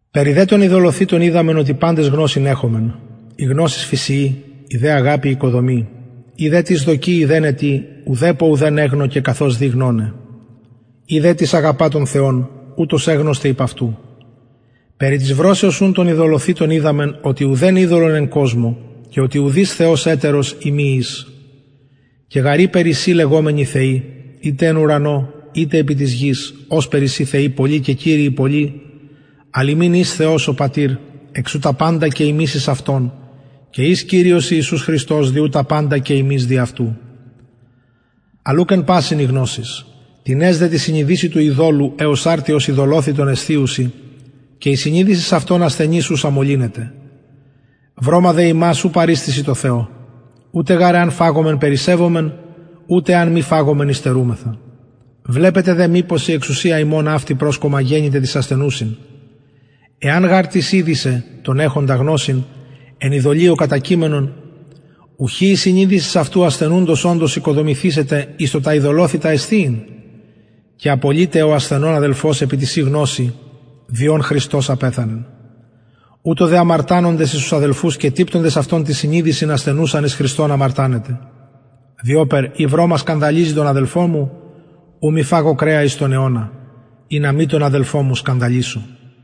περι δε των ειδωλοθυτων οιδαμεν οτι παντες γνωσιν εχομεν η γνωσις φυσιοι η δε αγαπη οικοδομει ει δε τις δοκει ειδεναι τι ουδεπω ουδεν εγνωκεν καθως δει γνωναι ει δε τις αγαπα τον θεον ουτος εγνωσται υπ αυτου περι της βρωσεως ουν των ειδωλοθυτων οιδαμεν οτι ουδεν ειδωλον εν κοσμω και οτι ουδεις θεος ετερος ει μη εις και γαρ ειπερ εισιν λεγομενοι θεοι ειτε εν ουρανω ειτε επι γης ωσπερ εισιν θεοι πολλοι και κυριοι πολλοι αλλ ημιν εις θεος ο πατηρ εξ ου τα παντα και ημεις εις αυτον και εις κυριος ιησους χριστος δι ου τα παντα και ημεις δι αυτου αλλ ουκ εν πασιν η γνωσις τινες δε τη συνειδησει του ειδωλου εως αρτι ως ειδωλοθυτον εσθιουσιν και η συνειδησις αυτων ασθενης ουσα μολυνεται βρωμα δε ημας ου παριστησιν τω θεω ουτε γαρ εαν φαγωμεν περισσευομεν ουτε εαν μη φαγωμεν υστερουμεθα βλεπετε δε μηπως η εξουσια υμων αυτη προσκομμα γενηται τοις ασθενουσιν εαν γαρ τις ιδη σε τον εχοντα γνωσιν εν ειδωλειω κατακειμενον ουχι η συνειδησις αυτου ασθενους οντος οικοδομηθησεται εις το τα ειδωλοθυτα εσθιειν και απολειται ο ασθενων αδελφος επι τη ση γνωσει δι ον χριστος απεθανεν ουτως δε αμαρτανοντες εις τους αδελφους και τυπτοντες αυτων την συνειδησιν ασθενουσαν εις χριστον αμαρτανετε διοπερ ει βρωμα σκανδαλιζει τον αδελφον μου ου μη φαγω κρεα εις τον αιωνα ινα μη τον αδελφον μου σκανδαλισω